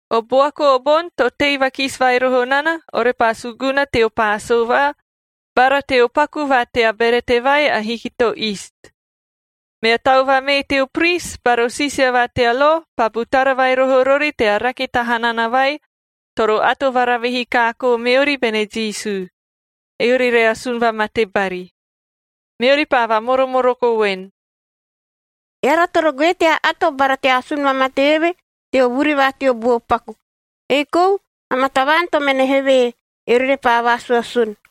O buaku o boni to tei vakisi vai roho nana, orepaa suguna teo Paasovaa bara teo Paku va tea Berete vai Ahiki to Iist. Mea tau vamee teo pris bara o siisia va tea lo paa butara vai roho rori tea rake ta hanana vai toro ato varavihi kaakoo meori bene Jisu, eori re asun vamate bari. Meori paa vamoromoroko voen, “Eara toro goe tea ato bara tea asun vamate eve teo vuri va teo buo paku, ei kou amaa tavaan to mene hevee, eori repaa vaasuasun.”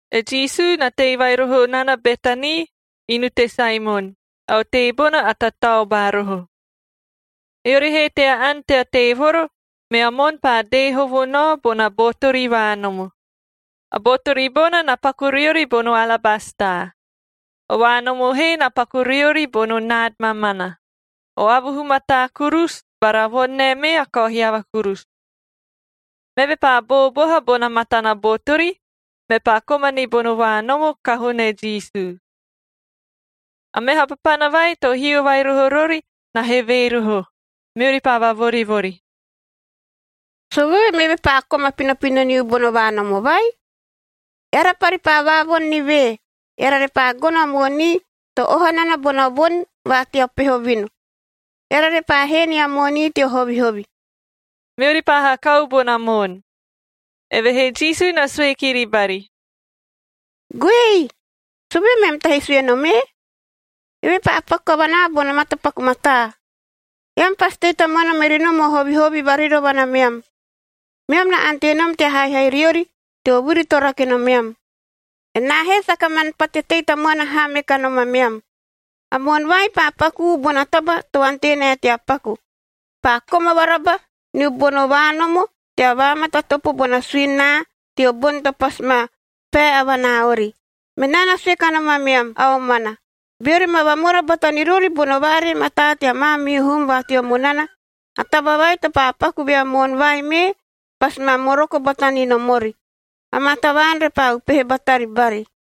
E Jisu na tei vai roho nana Betani, inu te Saemon, a otei bona a tataobaa roho. Eori he tea ani tea teevoro, mea moon paa dee hovo nao bona botori vaanomo. A botori bona na paku riori bono alabastaa.b O vaanomo he na paku riori bono naadc mamana, o avuhu mataa kurusu bara a voni nae mee a kao hiava kurusu. Meve paa booboha bona matana botori, mepaa koma ni bono vaanomo kahoo ne Jisu. A meha papana vai to hio vai roho rori na hevee roho, meori paa vavorivori, “Sovee meve paa koma pinopino niu bono vaanomo vai? Eara pari paa vaavoni ni vee, eara repaa gono a moonii to oha nana bona voni va teo peho vinu,d eara repaa hee nia moonii teo hovihovi.” Meori paa hakau bona moon. Evehee Jisu na sue kiri bari, “Goei! Sovee meam tahi sue nom ee? Eve paa paku kavanaa bono matapaku mataa. Eam pasi tei tamuana meri nom o hovihovi varirovana meam, meam na ante nom tea haihai riori teo vuri to rake nomeam. Enaa he saka man pate tei tamuana haa me kanom ameam. A moon vai paa pakuu bona taba to ante nae tea paku. Paa koma varaba niu bono vaanomo tea vaamatatopo bona suini naa teo boni to pasi ma pae avanaa ori. Menaa na sue kanom ameam a omana, beori ma vamora bata ni rori bono vaaree mataa tea maamihu hum va teo munana, a taba vai to paa paku vea moon vai mee, pasi ma moroko bata ni nom ori. Amaa tavaan repaa upehe batari bari.”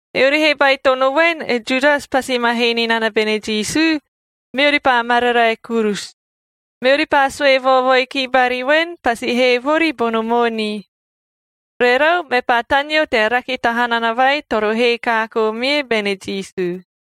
Eori he baitono voen, e Judas pasi ma hee ni nana bene Jisu, meori paa mararae kurusu. Meori paa sue vaovoi ki bari voen, pasi hee vori bono moonii. Rerau, mepaa taneo tea rake ta hanana vai toro hee kaakoo mie bene Jisu.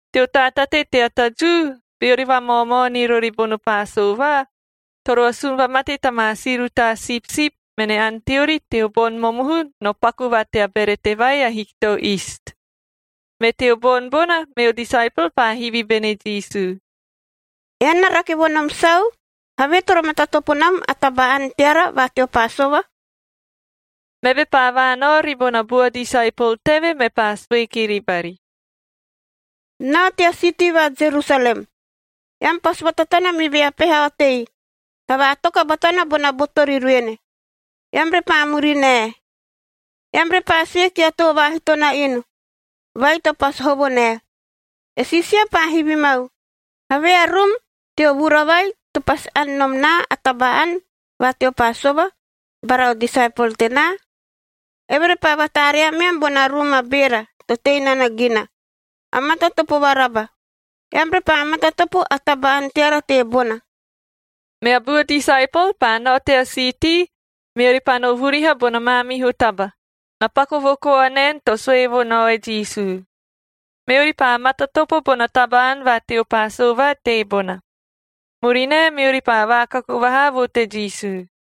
Teo taatate tea ta Jiu, beori vamaomao ni rori bono Paasova, toro asun vamate ta maa si rutaa sipsip mene ani teori teo boni momohu no Paku va tea Berete vai Ahiki to Iist. Me teo boni bona, meo disaepol paa hivi bene Jisu, “Ean na rake vo nom sau, havee toro matatopo nam a taba-ani teara va teo Paasova?” Meve paa vaanao ribona bua disaepol teve, mepaa sue kiri bari, “Nao tea siitii va Jerusalem. Eam pasi vatatana me vea peha otei, na vaatoka batana bona botori ruene, eam repaa murinae. Eam repaa sue kia too vaahito na inu vai to pasi hovo nae, ‘E Siisia paa hivi mau, “Havee a rum teo vura vai, to pasi ani nom naa a taba-ani va teo Paasova, bara o disaepol tenaa?”’ Eve repaa vataaree ameam bona rum a beera to tei nana gina, a matatopo varaba. Eam repaa matatopo a taba-ani teara teebona.” Mea bua disaepol paa nao tea siitii, meori paa no vuriha bona maamihu taba, na paku vo koa naen to sue vo nao e Jisu. Meori paa matatopo bona taba-ani va teo Paasova teebona. Murinae, meori paa vaakaku vahaa vo te Jisu.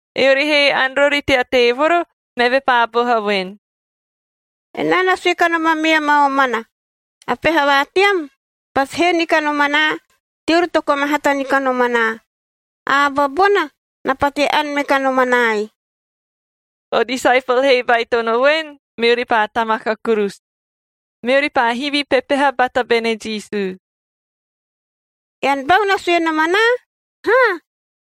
Eori he ani rori tea teevoro, meve paa boha voen, “Enaa na sue kanom ameam a omana, a peha va team pasi hee ni kanom anaa teori to koma hata ni kanom anaa. A aba bona na pate ani me kanom anaai.” O disaepol he baitono voen, meori paa tamaka kurusu. Meori paa hivi pepeha bata bene Jisu, “Ean bau na sue nom anaa, haa?”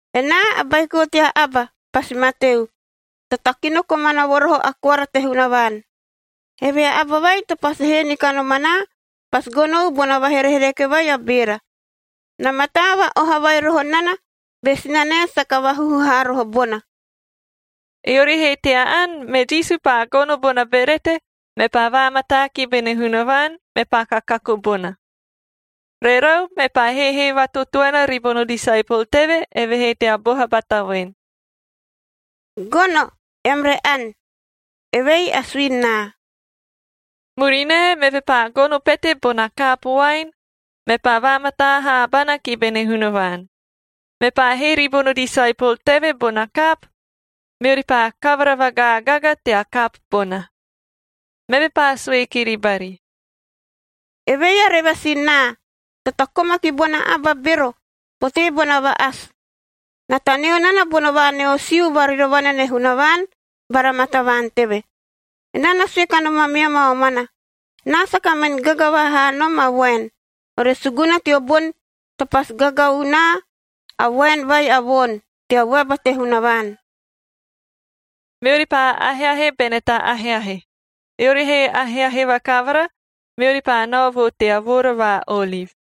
Enaa, a Baiko tea Aba pasi mateu, to takino komana vo roho a koara te Hunavaan. Evehee a aba vai to pasi hee ni kanom anaa pasi gonou bona vaherehereke vai a beera. Na mataa va-oha vai roho nana be sinanae saka vahuhu haa roho bona.” Eori he tea ani, me Jisu paa gono bona berete, mepaa vaamataa ki bene Hunavaan, mepaa kakaku bona. Rerau, mepaa heehee vatotoena ribono disaepol teve, eve he tea boha bata voen, “Gono, eam re ani, evei a suini naa.” Murinae, meve paa gono pete bona kaapu voaen, mepaa vaamataa haabana ki bene Hunavaan. Mepaa hee ribono disaepol teve bona kaapu, meori paa kavara vagaagaga tea kaapu bona. Meve paa sue kiri bari, “Evei a revasin naa, to takoma ki bona aba bero potee bona va-asi. Na taneo nana bono vaanoasiu varirovana ne Hunavaan bara maa tavaan teve. Enaa na sue kanom ameam a omana, enaa saka min gaga vaha haa nom a voaen, ore suguna teo boni to pasi gagau naa a voaen vai a voon tea vuaba te Hunavaan.” Meori paa aheahe bene ta aheahe. Eori he aheahe vakavara, meori paa nao vo tea Voora va Oliv.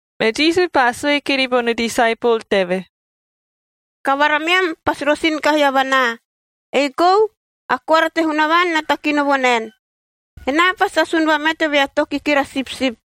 Me Jisu paa sue kiri bono disaepol teve, “Kavara meam pasi rosin kahi avanaa. Ei kou a Koara te Hunavaan na takino vo naen, ‘Enaa pasi asun vamate vea too kikira sipsip,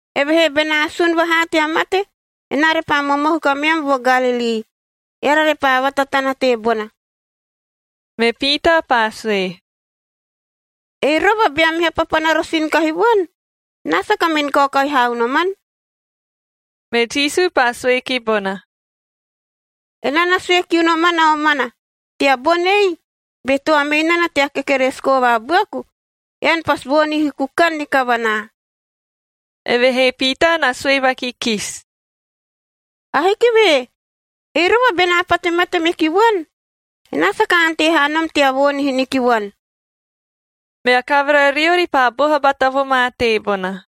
“Evehee benaa sun vahaa tea mate, enaa repaa momohu kameam vo Galilii, eara repaa vatatana teebona.” Me Piitaa paa sue, “Ei rova bea meha papana rosin kahi vuan, enaa saka min kaokahi haa unoman.” Me Jisu paa sue ki bona, “Enaa na sue kiu noman a omana, tea boni ei, be toa mei nana tea kekeresiko vaabuaku, ean pasi voonihi kukan ni kavanaa.” Evehee Piitaa na sue vakikisi, “Ahiki ve! Ei rova benaa pate mate meki vuan, enaa saka ante haa nom tea voonihi ni ki vuan.” Mea kavara riori paa boha bata vo ma teebona.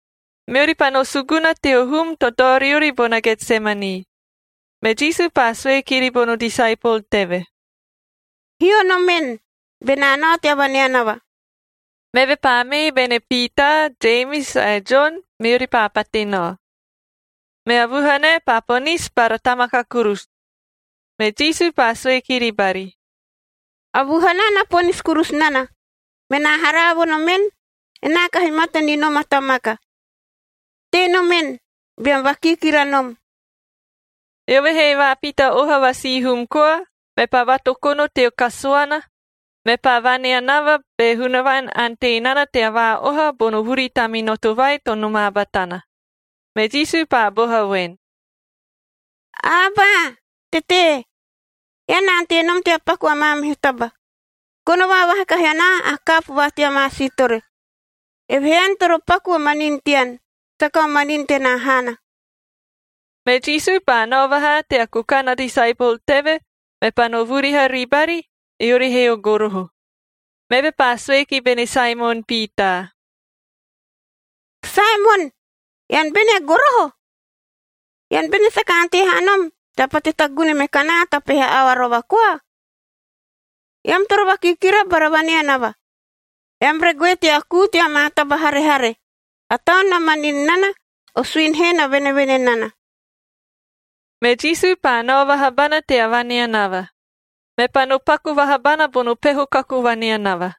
Meori paa no suguna teo hum to dao riori bona Getsemani, me Jisu paa sue kiri bono disaepol teve, “Hio nom en, benaa nao tea vaneanava.” Meve paa mee bene Piitaa, Jemis ae Jon, meori paa pate nao. Mea vuhanae paa ponisi bara tamaka kurusu. Me Jisu paa sue kiri bari, “A vuhanaa na ponisi kurusu nana, menaa haraa vo nom en, enaa kahi mate ni nom a tamaka. Tei nom en beam vakiikira nom.” Eove he vaapita oha va sihum koa, mepaa vatokono teo kasuana, mepaa vaneanava be Hunavaan ante nana tea vaa-oha bono vuri taminoto vai to nomaa batana. Me Jisu paa boha voen, “Abaa,g Tetee! Ean na ante nom tea paku a maamihu taba. Gono vaavaha kahi anaa a kaapu va tea maa siitore.h Evehee ean toro paku o manin tean. Saka o manin tenaa haana.” Me Jisu paa nao vahaa tea kukan a disaepol teve, mepaa no vuriha ribari eori he o goroho. Meve paa sue ki bene Saemon Piitaa, “Saemon! Ean bene a goroho? Ean bene saka ante haa nom tea pate tagune me kanaa ta peha aoa rova koa? Eam toro vakiikira bara vaneanava, eam re goe tea kuu tea maa taba harehare. A taun na manin nana, o suini he na venevene nana.” Me Jisu paa nao vaha bana tea vaneanava, mepaa no paku vaha bana bono peho kaku vaneanava.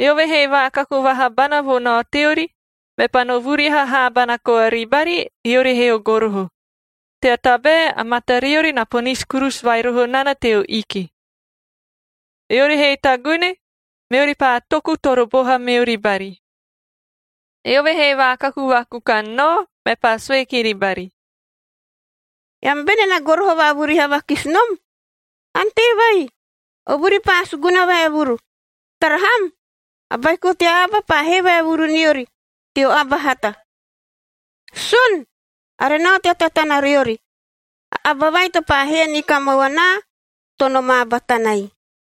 Eove he vaakaku vaha bana vo nao teori, mepaa no vuriha haabana koa ribari, eori he o goroho, tea tabae a matariori na ponisi kurusu vai roho nana teo iki. Eori he tagune, meori paa toku toro boha meori bari. Eove he vaakaku vaakukan nao, mepaa sue kiri bari, “Eam bene na goroho vaavuriha vakisi nom? Ante vai, o vuri paa suguna vaevuru. Tara ham! A Baiko tea Aba paa hee vaevuru niori teo aba hata. Sun! Are nao tea tatana riori. A aba vai to paa hee ni ka mau anaa to nomaa batanai.”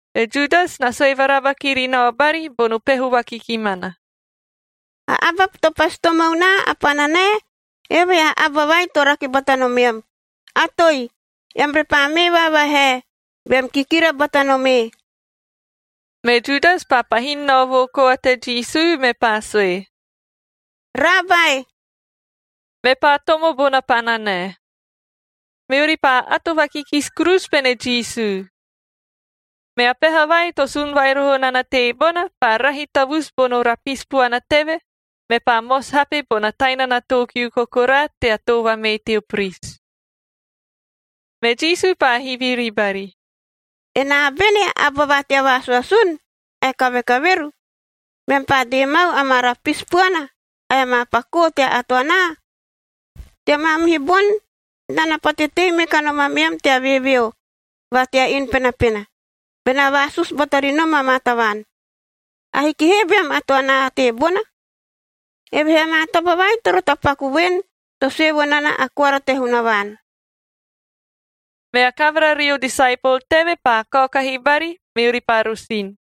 E Judas na sue varaba kiri nao bari bono peho vakikimana, “A aba to pasi tomo unaa a pananae, eove a aba vai to rake bata nomeam, atoi, eam repaa mee vaavahae, beam kikira bata nom ee.” Me Judas paa pahin nao vo koa te Jisu, mepaa sue, “Raabae!” Mepaa tomo bona pananae. Meori paa ato vakikisi kurusu bene Jisu. Mea peha vai to sun vai roho nana teebona, paa rahi tavusu bono rapisi puana teve, mepaa mosi hapej bona tainana too kiu kokoraa tea too vamee teo pris. Me Jisu paa hivi ribari, “Enaa bene a aba va tea vaasuasun ae kavekaveru, meam paa dee mau amaa rapisi puana ae amaa pakoo tea ato anaa? Tea maamihu boni, enaa na pate tei me kanom ameam tea veeveo va tea inu penapena, benaa vaasusu bata ri nom amaa tavaan. Ahiki he beam ato anaa teebona. Evehee amaa taba vai toro tapaku voen to sue vo nana a koara te Hunavaan.” Mea kavara rio disaepol teve paa kaokahi bari, meori paa rosin.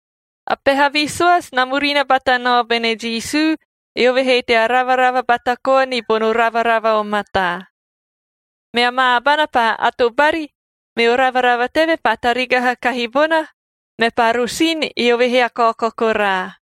A peha visoasi na murina bata nao bene Jisu, eove he tea ravarava bata koa ni bono ravarava o mataa. Mea maa abana paa ato bari, meo ravarava teve paa tarigaha kahi bona, mepaa rosin, eove he a kao kokoraa.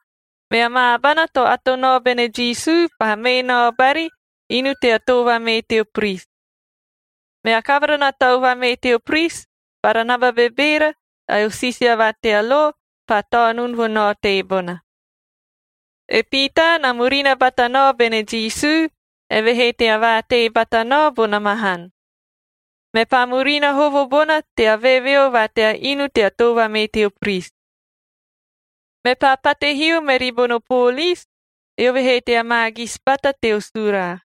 Mea maa abana to ato nao bene Jisu paa mee nao bari inu tea too vamee teo pris. Mea kavara na tau vamee teo pris, bara a naba bebeera ae o siisia va tea lo paa taonun vo nao teebona. E Piitaa na murina bata nao bene Jisu, eve he tea vaatei bata nao bona mahan. Mepaa murina hovo bona tea veeveo va tea inu tea too vamee teo pris. Mepaa pate hio meri bono poolis, eove he tea maagisi bata teo suraa.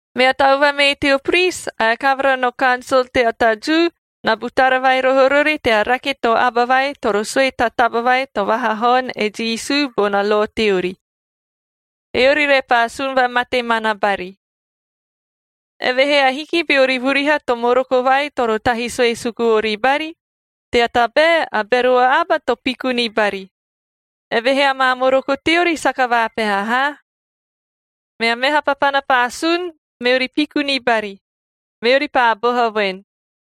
Mea tau vamee teo pris ae a kavara no kansol tea ta Jiuk na butara vai roho rori tea rake to aba vai toro sue ta taba vai to vahahaon e Jisu bona lo teori, eori repaa asun vamate mana bari. Evehee ahiki beori vuriha to moroko vai toro tahi sue suku ori bari, tea tabae a bero a aba to piku ni bari, evehee amaa moroko teori saka vaapeha haa. Mea meha papana paa sun, meori piku ni bari. Meori paa boha voen,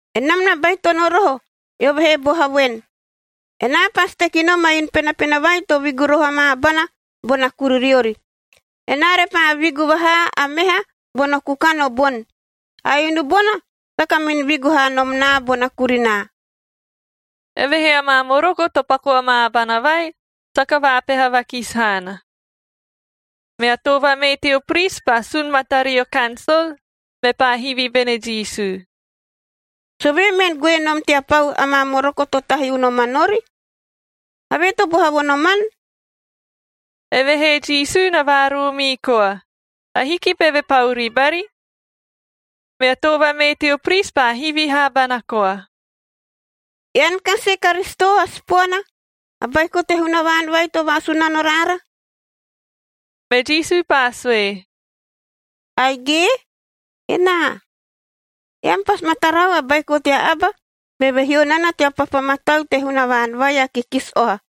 “Enam na baitono roho, eove he boha voen, ‘Enaa pasi teki nom a inu penapena vai to vigu roho amaa abana bona kuririori. Enaa repaa vigu vahaa a meha bono kukan o boni. A inu bona saka min vigu haa nom naa bona kurinaa.’” Evehee amaa moroko to paku amaa abana vai saka vaapeha vakisi haana. Mea too vamee teo pris paa sun matario kansol, mepaa hivi bene Jisu, “Sovee mean goe nom tea pau amaa moroko to tahi unoman ori? Havee to boha vo noman?” Evehee Jisu na vaaroomii koa, ahiki beve pau ribari. Mea too vamee teo pris paa hivi haabana koa, “Ean kasi e Karisito a Sipoana, a Baiko te Hunavaan vai to vaasunano raara?” Me Jisu paa sue, “Aige, enaa. Eam pasi ma tarau a Baiko tea Aba beve hio nana tea papa mataul te Hunavaan vai a Kikisi Oha.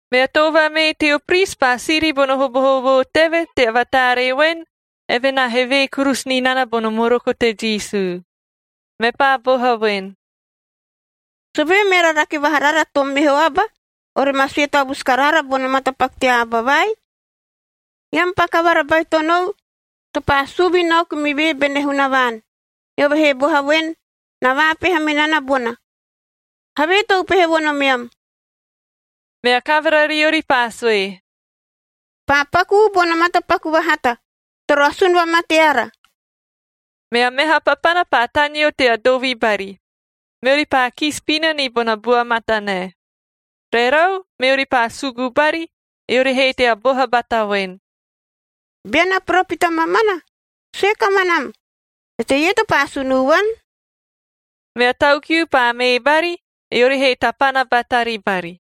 Mea too vamee teo pris paa siri bono hobohoboo teve tea vataaree voen, eve na hevee kurusu ni nana bono moroko te Jisu. Mepaa boha voen, “Sovee meara rake vaha rara to meho aba ore ma sue tavusu karaara bono matapaku tea aba vai? Eam paa kavara baitonou to paa suu vinaoku me vee bene Hunavaan, eove he boha voen, na vaapeha me nana bona. Havee to upehe vo nomeam?” Mea kavara riori paa sue, “Paa pakuu bono matapaku vahata, toro asun vamate ara.” Mea meha papana paa taneo tea dovi bari, meori paa kisi pina ni bona bua matanae. Rerau, meori paa sugu bari, eori he tea boha bata voen, “Bean a poropita mamana, sue kamanam, eteie to paa asunu vuan?” Mea tau kiu paa mee bari, eori he tapana batari bari.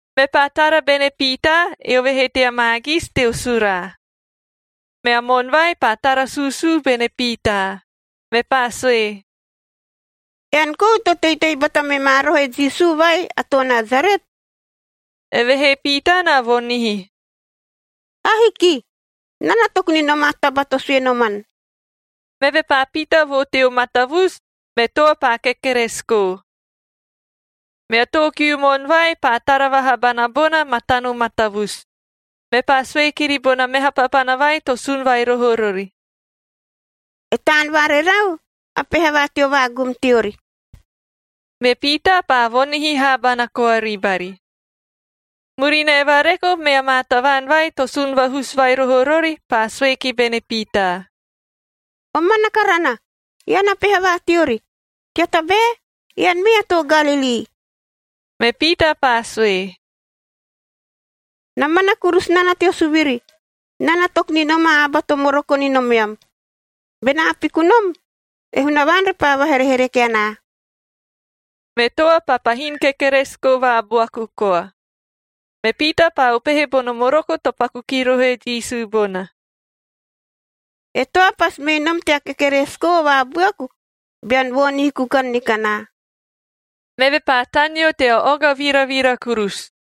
Mepaa tara bene Piitaa, eove he tea maagisi teo suraa. Mea moon vai paa tara suusuu bene Piitaa, mepaa sue, “Ean kou to teitei bata me ma roho e Jisu vai a too Nasaret?” Evehee Piitaa na voonihi, “Ahiki! Enaa na toku ni nom a taba to sue noman.” Meve paa pita vo teo matavusu, me toa paa kekeresiko. Mea too kiu moon vai paa tara vaha bana bona matano matavusu, mepaa sue kiri bona meha papana vai to sun vai roho rori, “E taan va rerau a peha va teo vaagum teori.” Me Piitaa paa voonihi haabana koa ribari. Murinae vareko, mea maa tavaan vai to sun vahusu vai roho rori paa sue ki bene Piitaa, “Omana karana, ean a peha va teori, tea tabae ean mee a too Galilii.” Me Piitaa paa sue, “Na mana kurusu nana teo suviri, enaa na toku ni nom a aba to moroko ni nomeam. Benaa piku nom, e Hunavaan repaa vaherehereke anaa.” Me toa paa pahin kekeresiko vaabuaku koa. Me Piitaa paa upehe bono moroko to paku ki roho e Jisu bona: “E toa pasi mei nom tea kekeresiko vaabuaku, bean voonihi kukan ni kanaa.” Meve paa taneo tea oga viravira kurusu.